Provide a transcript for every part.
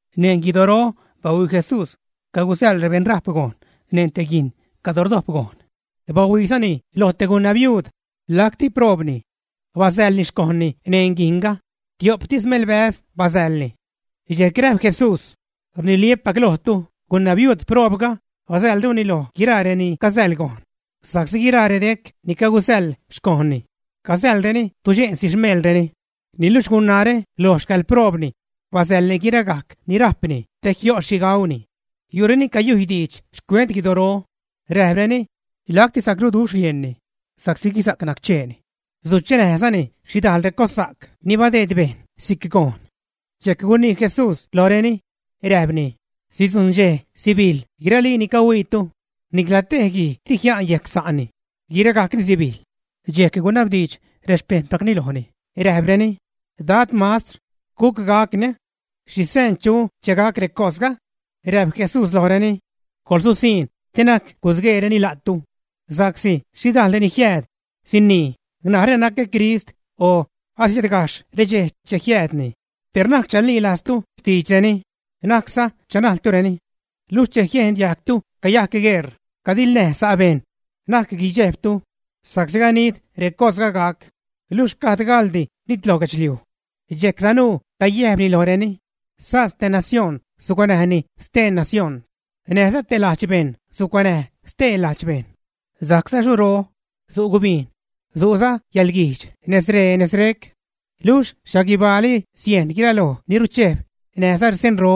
Neṉ guidoro bahuii Jesús cagusäḻ rebeṉrajp gojn neṉ te guijn cadro rdojp gojn. Bahuiizani lo te gunabiuud, lacti proobni. Basäḻni xcojnni neṉ guijnga, tio'ptis melbäz basäḻni. Dxejc räjp Jesús: ―Rniliä́pac lojtu, gunabiuud proobga basäḻruni loj guiraa reni casäḻ gojn, sa'csi guiraa redec ni cagusäḻ xcojnni casäḻreni tudxe'nsi xmeelreni, niluxh gunaare loj xcäḻproobni, basäḻni guiragajc ni rajpni te jio' xhi gauni. Yu' reni cayujy diidx xcuent guidoro, räjpreni: ―Lacti sacruduxh rieṉni sa'csi guisa'c naccheeni, suchenäjzani xhidajl recossa'c ni badeed bejṉ si'c gojn. Dxejc gunii Jesús lojreni, räjpni: ―Sidzujṉ dxej sibijḻ guiralii ni cahuiitu, nicla tej guij di jia'n yejc sa'ni, guiragajcni sibijḻ. Dxejc gunabdiidx rexpejṉpacni lojni, räjpreni: ―Dad, Mastr, ¿guc gacni? ¿Xhi seen chu che gac recosga? Räjp Jesús lojreni: ―¡Coḻsusiṉ te na'c gusgueereni la'tu! Sa'csi xhidajl reni jiääd sinii: “Narä nacä Crist”, o “Asiädgajxh redxej che jiäädni”, per na'c chalilajztu xtiidxreni, na'cza chanajltureni. Luxh che jiejn diajgtu cayajc gueṟ cadiḻnäj sa' bejṉ, na'c guidxejbtu, sa'csi ganid recosga gac, luxh gad gaḻdi nitloj guedxliuj. Dxejc sanuu cayäjpni lojreni: ―Säjs te nación, sucuanäj stee nación, näjza te ladx bejṉ sucuanäj stee lajdx bejṉ. Sajcza xuro, su' gubijn, su'za yäḻguijdx nez ree nez rec. Luxh xhaguibaali sieṉ guiraloj ni ruchejb näjza seenro.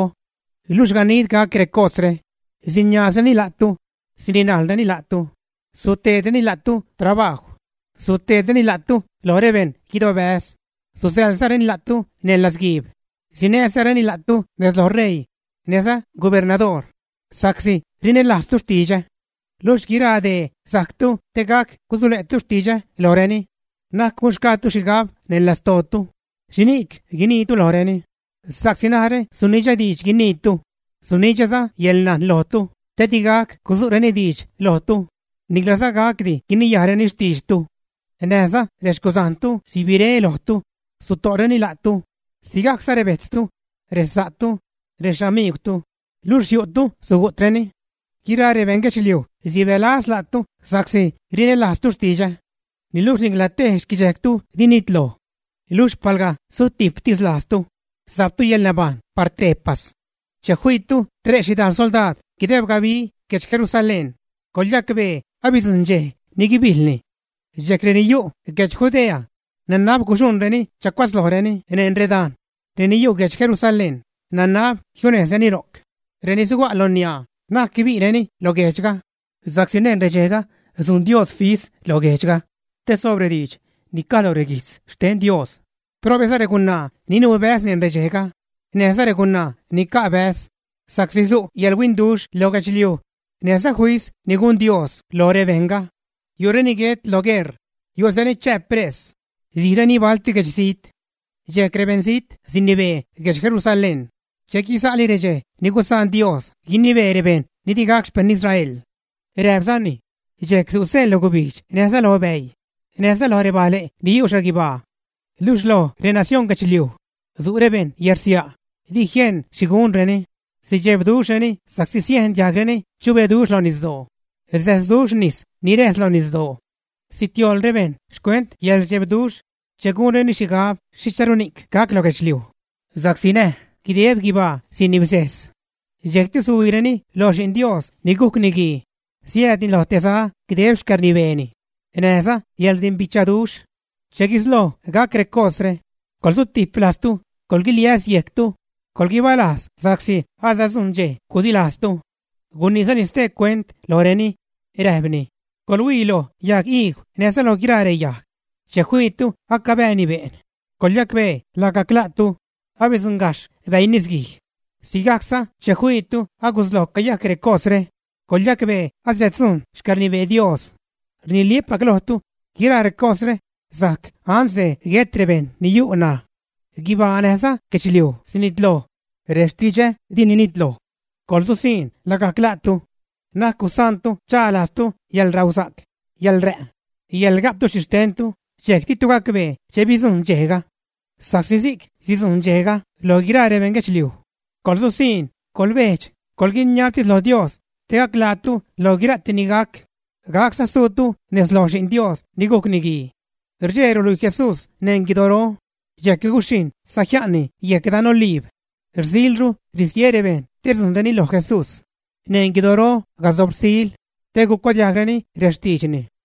’Luxh ganid gac recosre, siniaazreni la'tu, sirinajlreni la'tu, suteedreni la'tu trabajw. Suteedreni la'tu lo rebeṉ guidobäz, susäḻzareni la'tu neṉ latzguiib, sinäzareni la'tu nez loj ṟeii näjza gubernadoor sa'csi rinälajztu xtidxä. Luxh guiraa dee sajctu te gac gusule'tu xtidxä lojreni. Na'c gunxgaatu xhigab neṉ lastootu xhini'c guiniitu lojreni, sa'csi narä sunidxä diidx guiniitu, sunidxäza yäḻnajn lojtu te digac gudzu'reni diidx lojtu niclaza gacdi guiniyajreni xtiidxtu. Näjza rexcuzajntu sibire lojtu, suto'reni la'tu, sigajcza rebejtztu, resa'tu, rexamiigwtu, luxh yu'tu sugu'treni. Guiraa rebejṉ guedxliuj sibälaz la'tu sa'csi rinälajztu xtidxä. Niluxh ni'cla tej xquidxejctu di nitloj. Luxh palga sutijptis lajztu, sajptu yäḻnabajṉ par tejpas. ’Che fiitu tre' xhidajl soldaad guideb gabi guedx Jerusalén coḻyacbee abidzujṉ dxej ni guibijḻni. Dxejc reni yu' guedx Judea, nanab guxuṉreni chacuatzlojreni neṉ redajn; reni yu' guedx Jerusalén, nanab jiunejzreni ro'c; reni suga' lo niaa, na'c guibi'reni lo guejdxga, sa'csi neṉ redxejga sujn Dios fis lo guejdxga te soob rediidx ni caj lo reguijtz xten Dios. Probe'za regunaa ni nuu bäz neṉ redxejga, näjza regunaa ni ca' bäz, sa'csi su' yäḻhuinduxh lo guedxliuj, näjza fis ni gun Dios loj rebejṉga. Yu'reni guet lo gueṟ, yu'zareni chää pres, sijreni balti guedxzijt. Dxejc rebeṉzijt sinibee guedx Jerusalén che guiza'li redxej ni gusaan Dios guinibee rebejṉ ni di gac xpejṉ Israel. Räjpzani: ―Dxejc su' seen lo gubijdx näjza lo bäii, näjza loj rebajle' ni yu' xhaguibaa. Luxh lo renacioṉ guedxliuj su' rebejṉ yärsia', di jieṉ xhi gunreni, sidxebduxhreni sa'csi siejn diajgreni chubeduxh lo nisdoo, säsduxh nis ni räjs lo nisdoo. Sitioḻ rebejṉ xcuent yäḻrdxebduxh che gunreni xhigab xhicharuni'c gac lo guedxliuj, sa'csi näj guideb guibaa sinibsejs. Dxejcti suhuiireni lo Xi'n Dios ni gujc Niguii, siäädni lo te za guideb xcäḻrnibeeni, näjza yäḻrdimbichaduxh. Che guisloj gac recosre, coḻsutijp lajztu, coḻguiliäs yejctu, coḻguibalajz sa'csi asadzujṉ dxej gusilajztu. Guniizani stee cuent lojreni, räjpni: ―¡Coḻhuii lo yagiigw näjza lo guiraa reyajg! Che fiitu acabääni be'n, coḻyacbee lagajc la'tu, abidzuṉgajxh bäii nisguij. Sigajcza che fiitu agusloj cayajc recosre, coḻyacbee asiäddzujṉ xcäḻrnibee Dios. ’Rniliä́pac lojtu, guiraa recosre sajc ansde guet rebejṉ ni yu' ṉaj. Guibaa näjza guedxliuj sinitloj, rextidxä dini nitloj. ’¡Coḻsusiṉ lagajc la'tu! Na'c gusaantu cha lajztu yäḻrausa'c, yäḻrä', yäḻga'ptu xhixtentu, dxejc ditu gacbee che bidzujṉ dxejga. Sa'csi si'c sidzujṉ dxejga loj guiraa rebeṉ guedxliuj. Coḻsusiṉ, coḻbejdx, coḻguiniabtis lo Dios, te gac ḻaatu lo guira'ti ni gac, gacza suutu nez loj Xi'n Dios ni gujc Niguii. Rdxee ruluii Jesús neṉ guidoro dxejc guxhijṉ sajia'nni yejc dan Oliib. Rsilru ristie rebejṉ te rdzujṉreni lo Jesús neṉ guidoro casob rsil, te gucuadiajgreni rextiidxni.